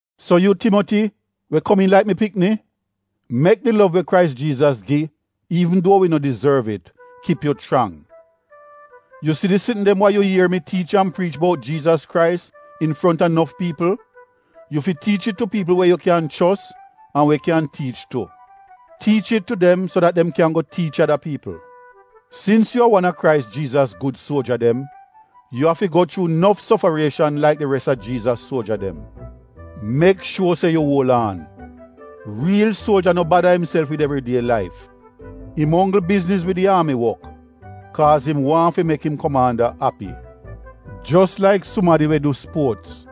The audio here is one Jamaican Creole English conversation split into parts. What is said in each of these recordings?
So yu, Timoti, we komiin laik mi pikni, mek di lov we Krais Jiizas gi iivn duo wi no dizorv it, kip yu chrang. Yu si di sitn dem wa yu ier mi tiich an priich bout Jiizas Krais infronta nof piipl, yu fi tiich it tu piipl we yu kyan chos an we kyan tiich tu. Tiich it tu dem so dat dem kyan go tiich ada piipl. Sins yu a wan a Krais Jiizas gud suoja dem, yu afi go chuu nof sofarieshan laik di res a Jiizas suoja dem. Mek shuo se yu uol aan. Riil suoja no bada imself wid evridie laif. Im onggl bizniz wid di aami wok, kaaz im waahn fi mek im komaanda api. Jos laik sumadi we du spuots,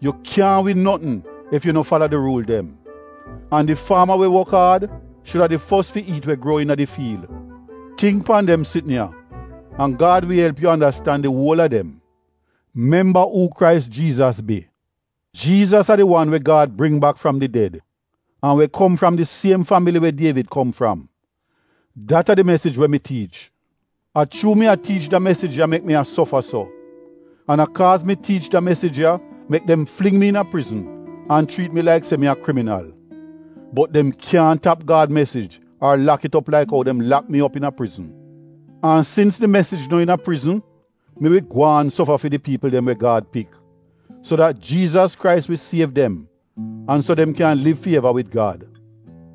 yu kyaahn win notn ef yu no fala di ruul dem. An di faama we wok aad, shuda di fos fi iit we gruo iina di fiil. Tingk pan dem sitn ya an Gad wi elp yu andastan di uol a dem. Memba uu Krais Jiizas bi. Jiizas a di wan we Gad bring bak fram di ded an we kom fram di siem fambili we Dievid kom fram. Dat a di mesij we mi tiich. A chuu mi a tiich da mesij ya mek mi a sofa so. An a kaaz mi tiich da mesij ya mek dem fling mi iina prizn an chriit mi laik se mi a kriminal. Bot dem kyaahn tap Gad mesij ar lak it op laik ou dem lak mi op iina prizn. An sins di mesij no iina prizn mi wi gwaan sofa fi di piipl dem we Gad pik. So dat Jiizas Krais wi siev dem an so dem kyan liv fi eva wid Gad.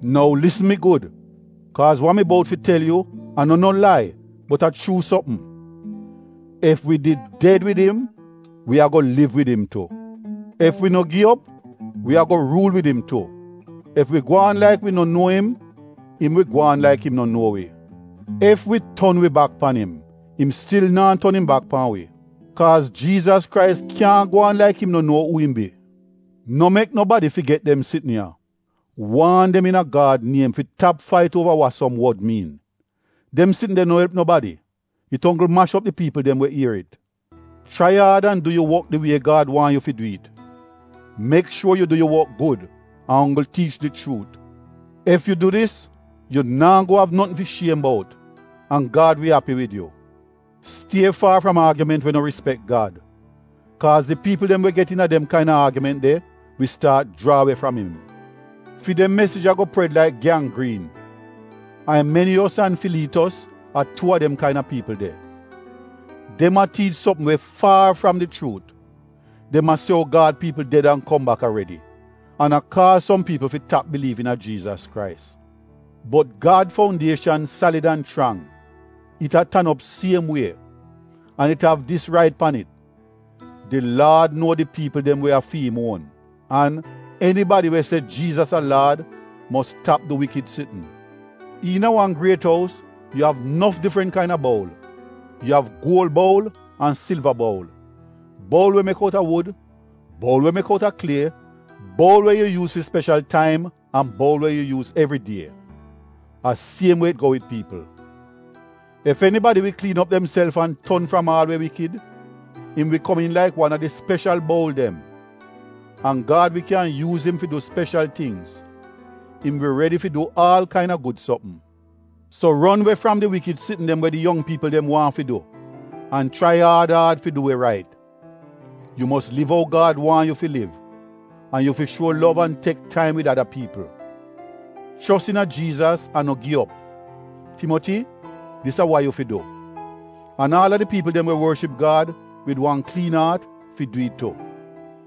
Nou lisn mi gud kaaz wa mi bout fi tel yu a no no lai bot a chuu sopm: Ef wi did ded wid im, Wi a-go liv wid im tu. Ef wi no gi op, Wi a-go ruul wid im tu. Ef wi gwaan laik wi no nuo im, im wi gwaan laik im no nuo wi. Ef wi ton wi bak pan im, im stil naa ton im bak pan wi. Kaaz Jiizas Krais kyaahn gwaan laik im no nuo uu im bi. No mek nobadi figet dem sitn ya. Waan dem iina Gad niem fi tap fait uova wa som wod miin. Dem sitn de no elp nobadi. It onggl mash op di piipl dem we ier it. Chrai aad an du yu wok di wie Gad waahn yu fi du it. Mek shuor yu du yu wok gud an onggl tiich di chuut. Ef yu du dis, yu naa go av notn fi shiem bout an Gad wi api wid yu. Stie faar fram aagiment we no rispek Gad. Kaaz di piipl dem we get iina dem kain-a aagiment de wi staat jraa we fram im. Fi dem mesij a-go pred laik gyanggriin. Aimeniyos an Filiitos a tuu a dem kain-a piipl de. Dem a tiich sopm we faar fram di chuut. Dem a se ou Gad piipl ded an kom bak aredi, an a kaaz som piipl fi tap biliiv iina Jiizas Krais. Bot Gad foundieshan salid an chrang, it a tan op siem wie. An it av dis rait pan it: “Di Laad nuo di piipl dem we a fi im uon,” an “Enibadi we se Jiizas a ‘Laad’ mos tap du wikid sitn.” Iina wan griet ous yu av nof difrant kain-a boul. Yu av guol boul an silva boul, boul we mek outa wud, boul we mek outa klie, boul we yu yuuz fi speshal taim an boul we yu yuuz evridie. A siem wie it go wid piipl. Ef enibadi wi kliin op demself an ton fram aal we wikid, im wi komiin laik wan a di speshal boul dem. An Gad wi kyan yuuz im fi du speshal tingz. Im wi redi fi du aal kain-a gud sopm. So ron we fram di wikid sitn dem we di yong piipl dem waahn fi du an chrai aad aad fi du we rait. Yu mos liv ou Gad waahn yu fi liv an yu fi shuo lov an tek taim wid ada piipl. Chos iina Jiizas an no gi op. Timoti dis a wa yu fi du. An aal a di piipl dem we worship Gad wid wan kliin aat fi du it tu.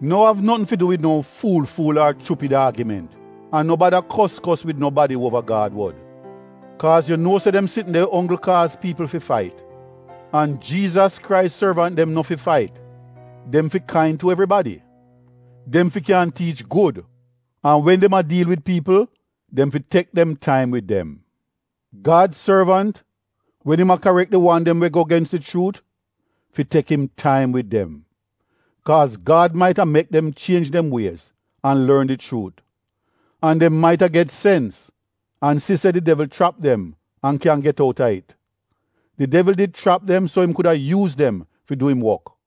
No av notn fi du wid no fuul-fuul ar chupid aagiment an no bada kos-kos wid nobadi uova Gad wod, kaaz yu nuo se dem sitn de onggl kaaz piipl fi fait. An Jiizas Krais sorvant dem no fi fait; dem fi kain tu evribadi. Dem fi kyan tiich gud an wen dem a diil wid piipl dem fi tek dem taim wid dem. Gad sorvant, wen im a karek di wan dem we go gens di chuut, fi tek im taim wid dem. Kaaz Gad mait-a mek dem chienj dem wiez an lorn di chuut. An dem mait-a get sens an si se di devl chrap dem an kyan get outa it. Di devl did chrap dem so im kuda yuuz dem fi du im wok.